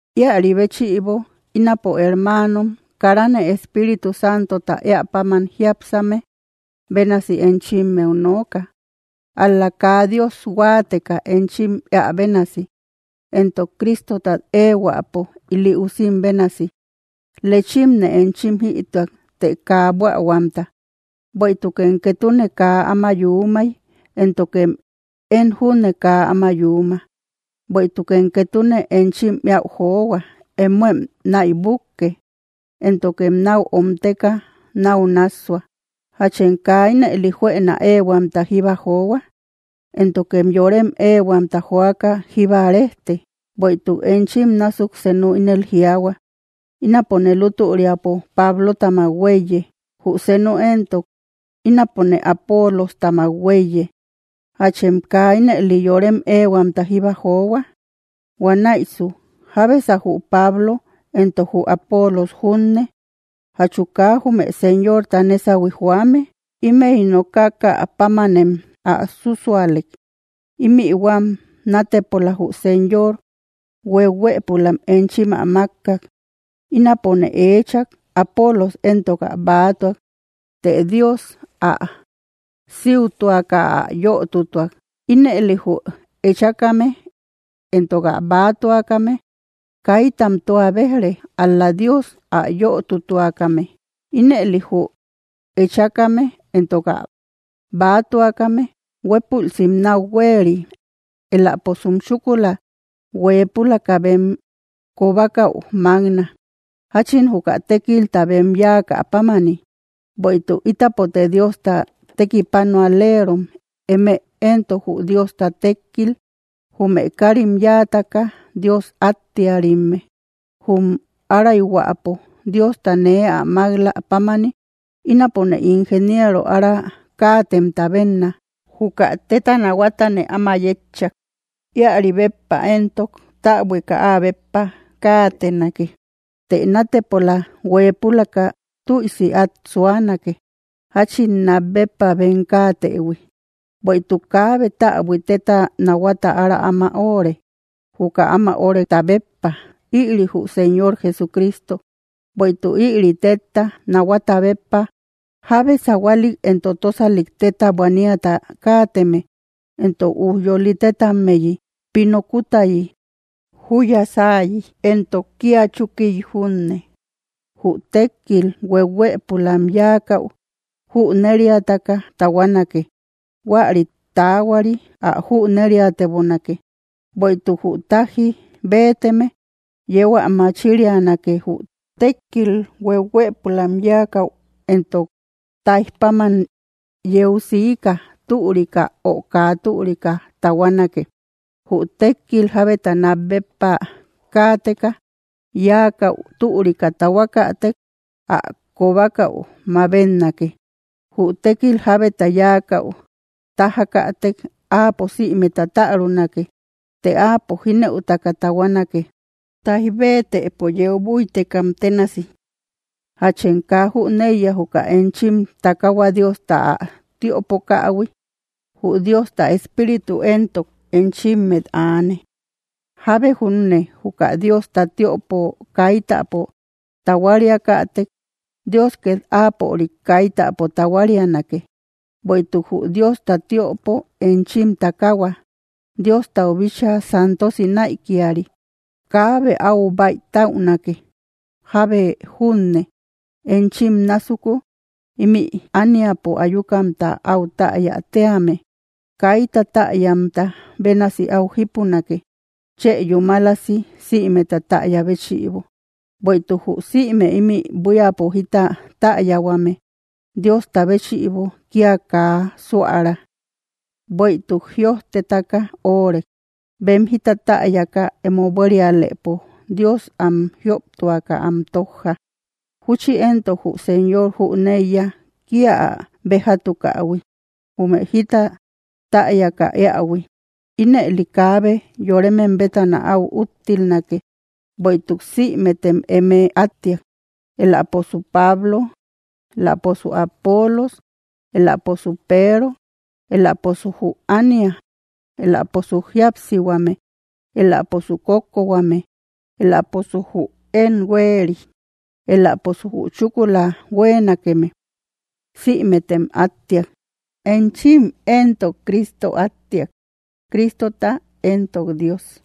Ïaribéchïbo ínapo hermanom, karane Espíritu Santota eäpáman jiapsäme bénasi enchimmeu nooka, ál‑la kaa Dios huateka enchim eä bénasi, entok Cristotat ehuäpo ili usim bénasi. Lechimne enchim jïtuak, të kaa buähuamta, bueïtukem ketune kaa áma yúmay, éntokem én júne kaa áma yúma, bueïtukem ketune enchim eäu johua; emoem naïbuke, éntokem nau omteka nau nassua, ¿jachem kaa ínëli juena ehuamta jíba johua? Éntokem yorem ehuamta joaka jíba rejte. Bueïtuk enchim násuk senu ínel jiaahua: “Ínapone lutüriapo Pablotamak huéiye”, jü senu entok: “Ínapone Apolostamak huéiye”, ¿jachem kaa ínëli yorem ehuamta jíba johua? Huanäisu, ¿jabesa jü Pablo entok jü Apolos junne? Jachu kaa jume Señorta nesahui joame, imey nokakäpamanem ä súsualek, imï huam natepola jü Señor huehuëpulam enchim ä makak. Ínapone eechak, Apolos entok ä bäatuak; të Dios ä siútuaka ä yötutuak. Ínëli jü echákame entok ä bäatuakame kaytam tua bejre, ál‑la Dios ä yötutuakame. Ínëli jü echákame entok ä bäatuakame huepulsim nau hueeri, eläposum chúkula huepülaka bem kobakäu makna, jachin juka tékilta bem yáakä pámani. Bueïtuk ítapote Diosta tekipanualerom, eme entok jü Diosta tékkil, jume karim yáataka Dios attiärimme. Jum arayhuäpo Diosta nee ä mak‑lä pámani, ínapone ingeniero ára kaatemta benna. Juka teta nahuatane áma yetchak, iäri béppa entok täbuika ä béppa kaatenake, të natepola huepülaka tüisi at suanake, jachin nat béppa bem kaatehui. Bueïtuk kaabe täbui teta nahuata ára áma öre, juka áma oreta béppa, ïri jü Señor Jesucristo. Bueïtuk ïri tetta nahuata béppa, jabbe sahualik entok tosalik teta buaaniata kaateme, entok ujyoli tetammeyi, pino kutayi, juya sáayi, entok kia chukiï junne, jü tekkil huehuëpulam yáakäú jüneriataka tahuanake; huäri taahuari: ä júneriatebonake, bueïtuk jü taji beeteme yeu ä machirianake; jü tekkil huehuëpulam yáakäu entok taijpáman yeu siika türika o kaa türika tahuanake. Jü tékil jabeta nat béppa kaateka yakáu turika tahuakatek, ä kobakau mabetnake. Jü tekil jábeta yáakäu tajakätek, áapo sïmeta tarunake, të áapo jineutaka tahuanake, taij bëtepo yeu buittekam ténasi. ¿Jachem kaa jüneiya juka enchim takahua Diosta ä tiöpokähui, jü Diosta Espíritu entok enchimmet aane? Jábe junne juka Diosta tiöpo kaitäpo tahuariakatek, Dios ket áapörik kaitäpo tahuarianake, bueïtuk jü Diosta tiöpo, enchim takahua, Diostau bíchaa santosi naïkiari. Kaabe áu baytaünake; jábe junne enchim násuku ímï ániapo ayukamta au täya tíame, kayta täyamta bénasi áu jípunake, chë yúmalasi sïmeta täya béchïbo. Bueïtuk jü sïme ímï buíapo jita täyahuame Diosta béchïbo kia kaa suära; bueïtuk jiojtetaka órek: “Bem jita täyaka emo buérialëpo Dios am jioptuaka am tojja.” Júchi entok: “Jü Señor jüneiya kia ä bejatukähui jume jita täyaka eähui.” Ínëli, kaabe yoremem bétana au úttilnake, bueïtuk sïmetem eme attiak: eläposu Pablo, eläposu Apolos, eläposu Peero, eläposu jü ánia, eläposu jíapsihuame, eläposu kókkohuame, eläposu jü én hueri, eläposu jü chúkula hueenakeme, sïmetem attiak. Enchim entok Cristo attiak, Cristota entok Dios.